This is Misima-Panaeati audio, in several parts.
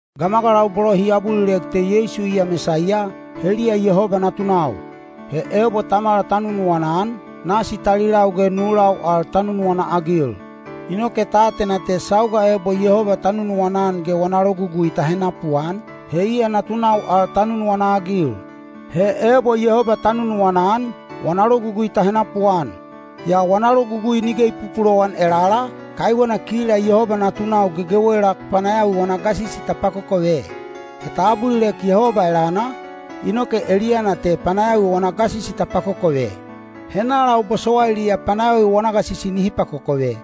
Gamagalau bolo hi abulilek te Yeisu iya Mesaiya, heliya Yehoba natunau. He ebo tamala ta nunuwana-an, nasi talilau ge nulau al ta nunuwana-agil. Inoke ta atena te sauga ebo Yehoba ta nunuwana-an ge wana logugui ta henapuan, he iya natunau al ta nunuwana-agil. He ebo Yehoba ta nunuwana-an, wana logugui ta henapuan. Yaa wana logugui nige i pupulowan elala, kaiwena kila Yehoba natunau gegewela panayawi wana gasisi ta pakokove. He ta abulilek Yehoba elana, inoke eliyana te panayawi wana gasisi ta pakokove. Henalau bosowailiya panayawi wana gasisi nihi pakokove?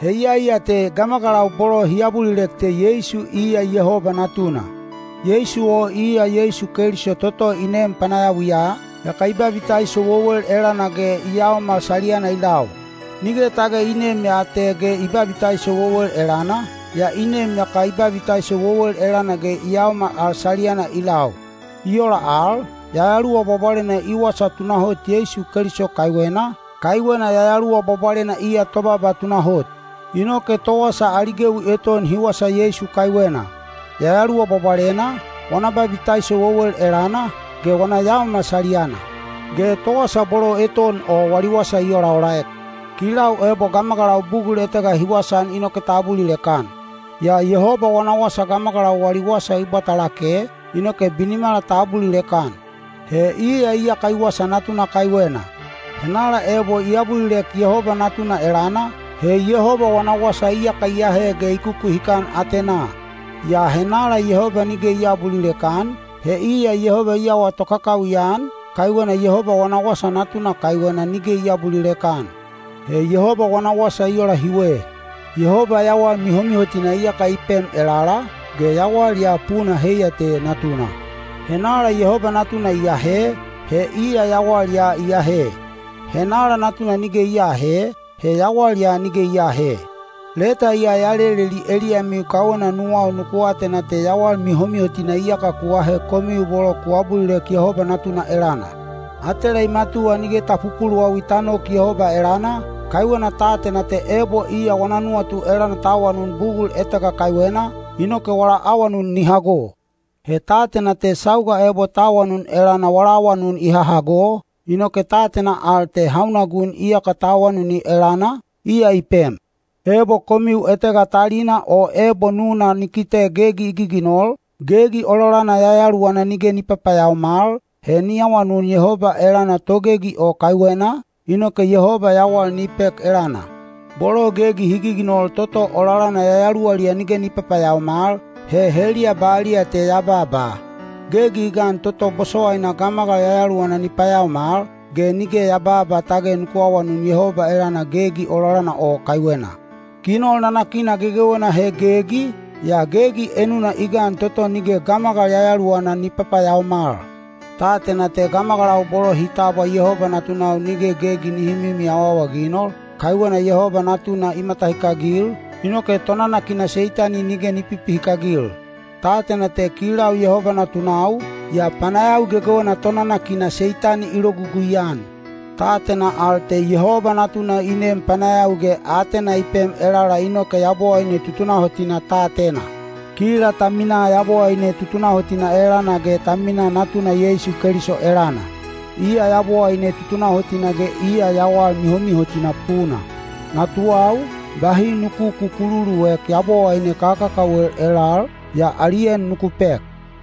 He iyai ya te gamagalau bolo hi abulilek te Yeisu iya Yehoba Natuna. Yeisu o iya Yeisu Keliso toto i nem panayawiya, yaka i babitaiso wewel elana ge i yaomal saliyana i lau. Nige tage i nem ya te ge i babitaiso wewel elana, yaa i nem yaka i babitaiso wewel elana ge i yaomal al saliyana i lau. I ola al, Yayaluwa Bwabwalena i wasa tunahot Yeisu Keliso kaiwena, kaiwena Yayaluwa Bwabwalena iya tobaaba tunahot. Inoke towasa ali gewi eton hi wasa Yeisu kaiwena: Yayaluwa Bwabwalena, wana babitaiso wewel elana, ge wana yaomal saliyana. Ge towasa bolo eton o wali wasa i olaolaek. Kilau ebo gamagalau bugul etega hi wasaan inoke ta abulilek-an. Yaa Yehoba wana wasa gamagalau wali wasa i bwata lake, inoke binimala ta abulilek-an. He iya iyaka i wasa Natuna kaiwena. Henala ebo i abulilek Yehoba Natuna elana, he Yehoba wana wasa iyaka i ahe ge i kukuhikan atenaa. Yaa henala Yehoba nige i aabulilek-an, he iya Yehoba i awa tokakawi-an, kaiwena Yehoba wana wasa Natuna kaiwena nige i aabulilek-an. He Yehoba wana wasa i ola hiwe: Yehoba yawal mihomihotina iyaka i pem elala, ge yawal ya puna heiya te Natuna. Henala Yehoba Natuna i ahe, he iya yawal ya i ahe; henala Natuna nige i aahe, he yawal ya nige i aahe. Leta ya ya leleli eliyamiu kaiwena nuwau nuku atena te yawal mihomihotina iyaka ku ahe—komiu bolo ku abulilek Yehoba Natuna elana. Atela i matuwa nige ta pupuluwawi ta nok Yehoba elana, kaiwena ta atena te ebo iya wana nuwatu elana ta awanun bugul etega kaiwena, inoke wala awanun ni hago. He ta atena te sauga ebo ta awanun elana wala awanun i hahago, inoke ta atena al te hauna gun iyaka ta awanuni elana, iya i pem. Ebo komiu etega talina o ebo nuna ni kite gegi i giginol, gegi ololana yayaluwana nige ni papayaomal, he ni awanun Yehoba elana togegi o kaiwena, inoke Yehoba yawal ni pek elana. Bolo gegi hi giginol toto ololana yayaluwaliya nige ni papayaomal, he heliya baliya te ya babaa. Gegi i gan toto bosowaina gamagal yayaluwana ni payaomal, ge nige ya babaa tage nuku awanun Yehoba elana gegi ololal o kaiwena. Ginol nanakina gegewena he gegi, yaa gegi enuna i gan toto nige gamagal yayaluwana ni papayaomal. Ta atena te gamagalau bolo hi tabwa Yehoba natunau nige gegi nihi mimi awaawaginoli, kaiwena Yehoba Natuna i matahikagil, inoke tonanakina Seitani nige ni pipihikagil. Ta atena te kilau Yehoba natunau, yaa panayawi gegewena tonanakina Seitani i logugui-an. Ta atena al te Yehoba Natuna i nem panayawi ge aatena i pem elala inoke Yabowaine tutunahotina ta atena. Kila ta minaa Yabowaine tutunahotina elana ge ta minaa Natuna Yeisu Keliso elana. Iya Yabowaine tutunahotina ge iya yawal mihomihotina puna. Natuwau, bahi nuku kukululuek yabowaine kakakawel elal, yaa ali en nuku pek.